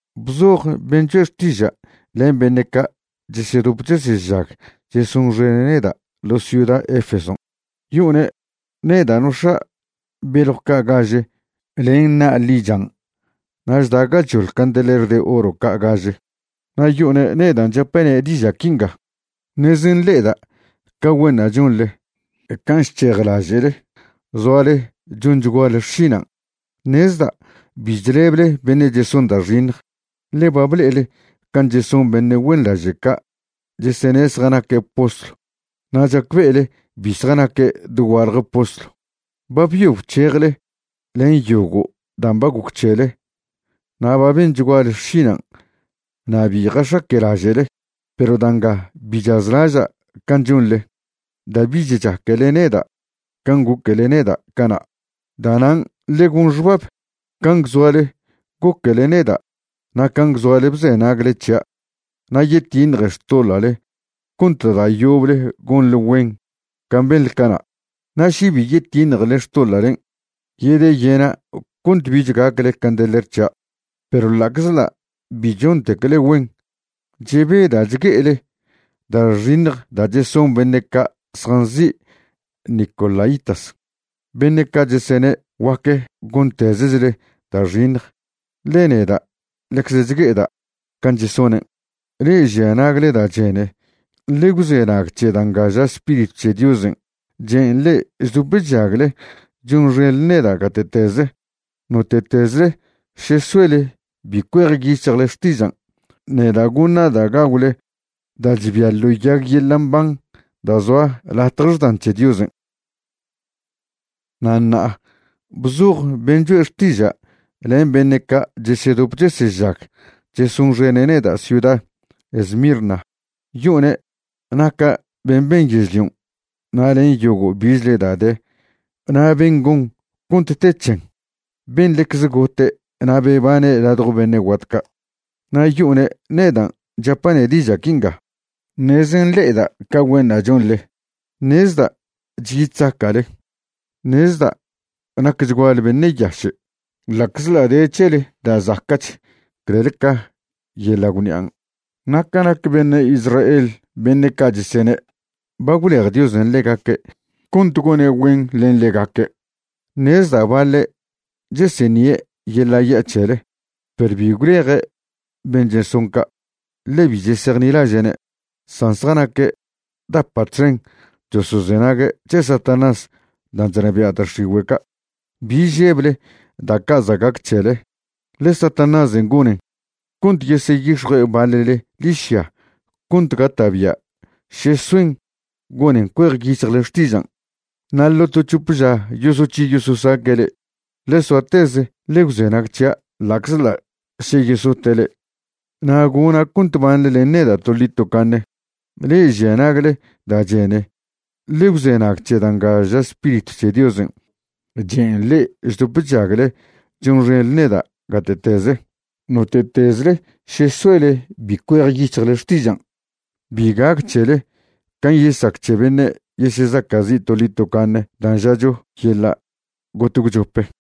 ’Bzoj ben' choe' xtiža' len beṉe' ca' chesedop chesežag chesonxene' neda' ḻo ciuda Efeson', yo'one' neda' nox̱a' beljw ca' gaže len na' ḻichan' na' chda' gachoḻ candeler de oro ca' gaže, na' yo'one' nedan' chapa'ne' diža' quinga: “Ṉeze nḻe'eda' ca güenṉa' chonḻe, can' chc̱hejlaže'le zoale chonchguale xšinan'. Ṉezda' bi chleble beṉe' cheson da' xiṉj, ḻe ba ble'ele can' cheson beṉe' güenḻaže' ca' chesene zjanaque' postlw na' chacbe'ele bi zjanaque' dogualje postlw. Ba byo bc̱hejle len yogo' dan' ba goc c̱hele na' ba benchguale xšinan' na' bi jax̱aque'laže'le. Perw da' nga bi chazlaža' can' chonḻe, da' bich chaquele neda' can' goquele neda' cana'. Da'nan' ḻe gon xbab can' gwzoale goquele neda' na' can' gwzoale bzenagle c̱hia' na' yetiṉje xtoḻa'le cont da' yoble gonḻe güen can' benḻe cana'. Na' še bi yetiṉjele xtoḻa'len', yedeyena' cont bich gacle candeler c̱hia'. Perw ḻa'czḻa' bi chontecle güen, chebeda' chgue'ele da' xiṉj da' cheson beṉe' ca' zjanzi' nicolaítas, beṉe' ca' chesene' guac gontezechle da' xiṉj, ḻe neda' ḻecze chgue'eda' can' chesonen'. Le'e žia nagle da' chene, ḻe gwzenag c̱he da' nga ža Spiritw c̱he Diosen' chen' le'e chdop chžagle chonxenḻe neda' gate'teze: Note'tezle še soele bi cuejyic̱hjle xtižan', neda' goṉa' da' gagwle da' chbia ḻo yag yeḻa' mban da' zoa latje xdan c̱he Diosen'.” ’Na' ṉa'a bzoj ben' choe' xtiža' len beṉe' ca' chesedop chesežag chesonxen neda' ciuda Esmirna, yo'one' naca' ben' ben yežlion' na' len yogo' bichle da' de na' ben' gon cont te c̱hen, ben' ḻecze gote' na' bebane' ladjo beṉe' guat ca', na' yo'one' nedan' chapa'ne' diža' quinga: “Ṉeze nḻe'eda' ca güenṉa' chonḻe. Ṉezda' chyi chzaca'le. Ṉezda' nacchguale beṉe' yaše', ḻa'czḻa' de c̱hele da' zaca'ch clel ca yeḻa' gwṉi'an'. Ṉa' ca nac beṉe' Israel beṉe' ca' chesene' ba gwlej Diosen' ḻegaque' cont gone' güen len ḻegaque', ṉezda' baḻe' cheseṉie' yeḻa' ya' c̱hele. Perw bi gwleje' ben' cheson ca', ḻe bi chesejnilaže'ne', san zjanaque' dapa' txen chosozenague' c̱he Satanás dan' chnabia' da' x̱igüe' ca'. Bi žeble da' ca' za' gac c̱hele, ḻe Satanásen' gonen cont yeseyix̱jue' baḻle ḻižya cont gata'bia' še soen gonen cuejyic̱hjle xtižan'. Na' ḻo to c̱hope ža yosoc̱hi yososaque' le'e. Ḻe soateze ḻe gwzenag c̱hia' ḻa'czḻa' še yesote' le'e, na' gona' cont banḻe len neda' toḻi tocaṉe. Le'e žia nagle da' chene, ḻe gwzenag c̱he da' nga ža Spiritw c̱he Diosen' chen' le'e chdop chžagle chonxenḻe neda' gate'teze: Note'tezle še soele bi cuejyic̱hjle xtižan', bi gac c̱hele can' yesac c̱he beṉe' yesezaca'zi' toḻi tocaṉe dan' žacho yeḻa' got gwchope.”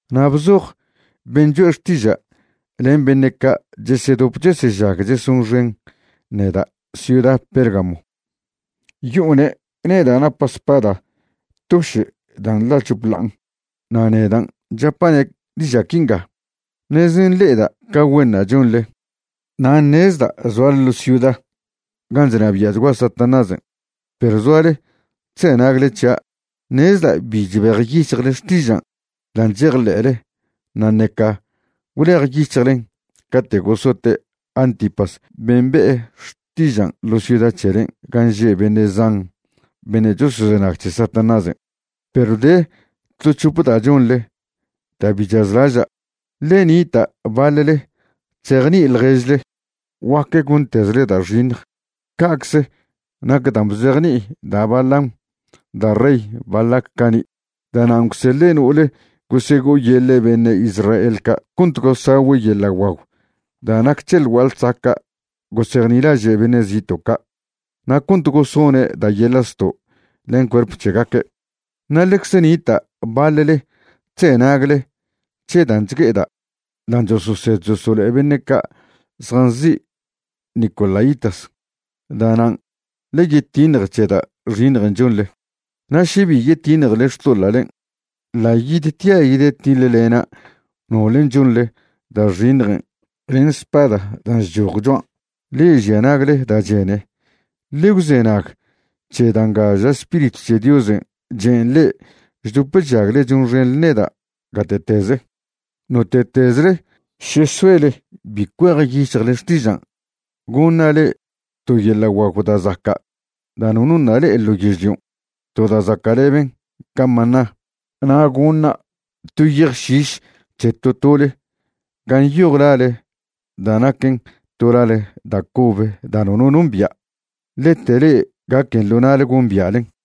’Na' bzoj ben' choe' xtiža' len beṉe' ca' chesedop chesežag chesonxen neda' ciuda Pérgamo, yo'one' neda' napa' spada toše' dan' nḻa chop ḻa'an, na' nedan' chapa'ne' diža' quinga: “Ṉeze nḻe'eda' ca güenṉa' chonḻe. Na' ṉezda' zoale ḻo ciuda gan' chnabia'chgua Satanásen', perw zoale chzenagle c̱hia'. Ṉezda' bi chbejyic̱hjle xtižan' dan' chejḻe'le na' ṉeca gwlejyic̱hjlen cate' gosote' Antipas ben' be'e xtižan' ḻo ciuda c̱helen' gan' že' beṉe' zan beṉe' chosozenag c̱he Satanásen'. Perw de to c̱hope da' chonḻe da' bi chazlaža'. Ḻe nita' baḻle chzejni'i ḻježle guac gontezle da' xiṉj. Ca'cze nac dan' bzejni'i da' Balaam da' rey Balac cani'. Da'nan' gwseḻe' no'ole gosego'oyeḻe' beṉe' Israel ca' cont gosagüe' yeḻa' guagw da' nac c̱he ḻ gua'a ḻsaca' gosejnilaže' beṉe' zito' ca' na' cont gosone' da' yeḻa' zto' len cuerp c̱hegaque'. Na' ḻecze nita' baḻle chzenagle c̱he dan' chgue'eda' dan' chososed chosolo'e beṉe' ca' zjanzi' nicolaítas. Da'nan' ḻe yetiṉje c̱he da' xiṉjen' chonḻe. Na' še bi yetiṉjele xtoḻa'len', ḻa' yidtia' yedetiḻlena' nole chonḻe da' xiṉjen' len spada dan' chchoj choan'. Le'e žia nagle da' chene, ḻe gwzenag c̱he da' nga ža Spiritw c̱he Diosen' chen' le'e chdop chžagle chonxenḻe neda' gate'teze: Note'tezle še soele bi cuejyic̱hjle xtižan', goṉa' le'e to yeḻa' guagw da' zaca' da' nono ṉa' le'e ḻo yežlion', to da' zaca'leben ca maná, na' goṉa' to yej šiš c̱he to tole gan' yoj lale da' naquen to lale da' cobe da' nono nombia', lete le'e gaquen ḻo na'le gombia'len.”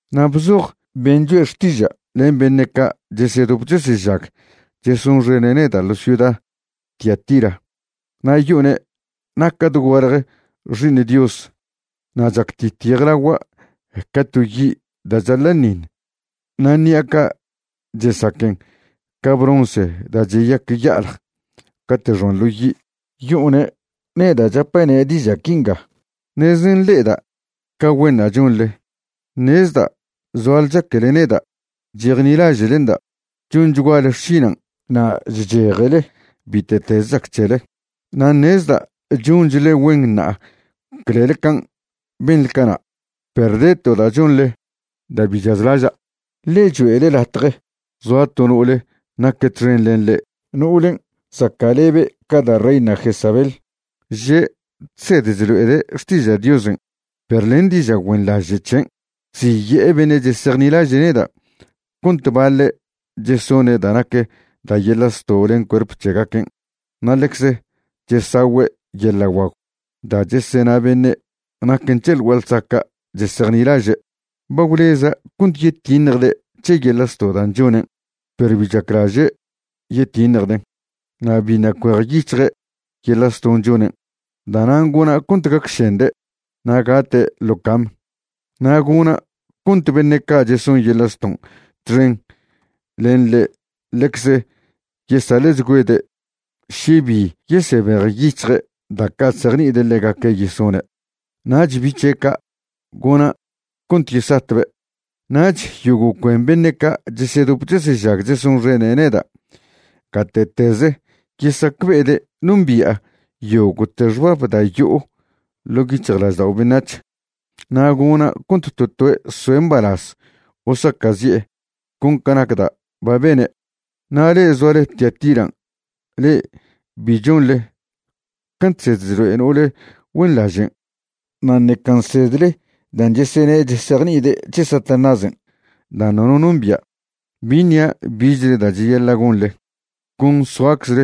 ’Na' bzoj ben' choe' xtiža' len beṉe' ca' chesedop chesežag chesonxene' neda' ḻo ciuda Tiatira, na' yo'one' naca' dogualje Xi'iṉ Dios, na' chactit yejlagua' ca to yi' da' chaḻa'ṉiṉ na' ṉi'a ca' chesaquen ca bronce da' cheyac ya'aḻj cate' xoan ḻo yi'. Yo'one' neda' chapa'ne' diža' quinga: “Ṉeze nḻe'eda' ca güenṉa' chonḻe, ṉezda' zoale chaquele neda', chejnilaže'lenda', chonchguale xšinan' na' chchejele bite'teze chac c̱hele, na' ṉezda' chonchḻe güen ṉa'a clel can' benḻe cana'. Perw de to da' chonḻe da' bi chazlaža', ḻe choe'le latje zoa to no'ole naque' txen len le'e, no'olen' zaca'lebe ca da' reina Jezabel. Že' chsed chlo'ede' xtiža' Diosen' perw len diža' güenḻaže' c̱hen' chziye'e beṉe' chesejnilaže' neda' cont baḻe' chesone' da' nac da' yeḻa' zto' len cuerp c̱hegaquen' na' ḻecze chesagüe' yeḻa' guagw da' chesena beṉe' naquen c̱he ḻ gua'a ḻsaca' chesejnilaže'. Ba gwleza' cont yetiṉjde' c̱he yeḻa' zto' dan' chonen', perw bi chaclaže' yetiṉjden', na' biṉa' cuejyic̱hje' yeḻa' zton' chonen'. Da'nan' gona' cont gacšende' na' gate' ḻo cam, na' gona' cont beṉe' ca' cheson yeḻa' zton' txen len ḻe' ḻecze yesaḻe'chgüede' še bi yesebejyic̱hje' da' ca' chzejni'ide' ḻegaque' yesone'. Nach bi' c̱he' ca', gona' cont yesatbe'. Nach yogo' cuen beṉe' ca' chesedop chesežag chesonxene' neda' gate'teze yesacbe'ede' nombi'a yogo'te xbab da' yo'o ḻo' yic̱hjlaždao' beṉac̱h, na' gona' cont to toe' soe' mbalaz o saca'zi'e con ca nac da' ba bene'. Na' le'e zoale Tiatiran' le'e bi chonḻe can' chsed chlo'e no'ole güenḻažen' na' ṉeca nsedle dan' chesene' chesejni'ide' c̱he Satanásen' dan' nono nombia', bi ṉia' bichle da' cheyaḻa' gonḻe. Con soaczle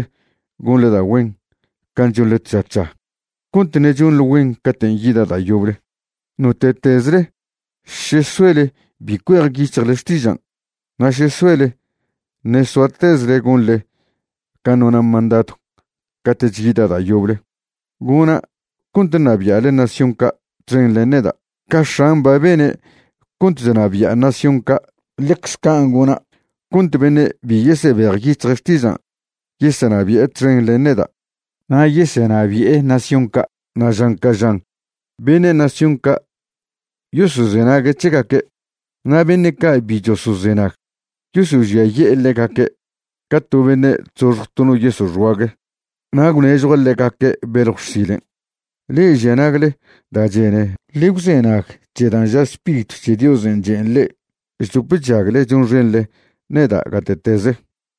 gonḻe da' güen can' chonḻe tža tža, cont ṉe' chonḻe güen caten' yida' da' yoble. Note'tezle še soele bi cuejyic̱hjle xtižan', na' še soele ṉe' soatezle gonḻe can' nona' mandadw cate'ch yida' da' yoble, gona' cont ṉabia'le nación ca' txen len neda'. Ca X̱an' ba bene' cont chnabi'a nación ca', ḻecze can' gona' cont beṉe' bi yesebejyic̱hje' xtiža' yesenabi'e txen len neda'. Na' yesenabi'e nación ca' na' žan ca žan beṉe' nación ca' yosozenague' c̱hegaque', na' beṉe' ca' bi chosozenag, yosožiaye'e ḻegaque' ca to beṉe' chzoxj to no yeso' xguague. Na' gwnežjua' ḻegaque' beljw xsilen'. Le'e žia nagle da' chene, ḻe gwzenag c̱he dan' ža Spiritw c̱he Diosen' chen' le'e chdop chžagle chonxenḻe neda' gate'teze.”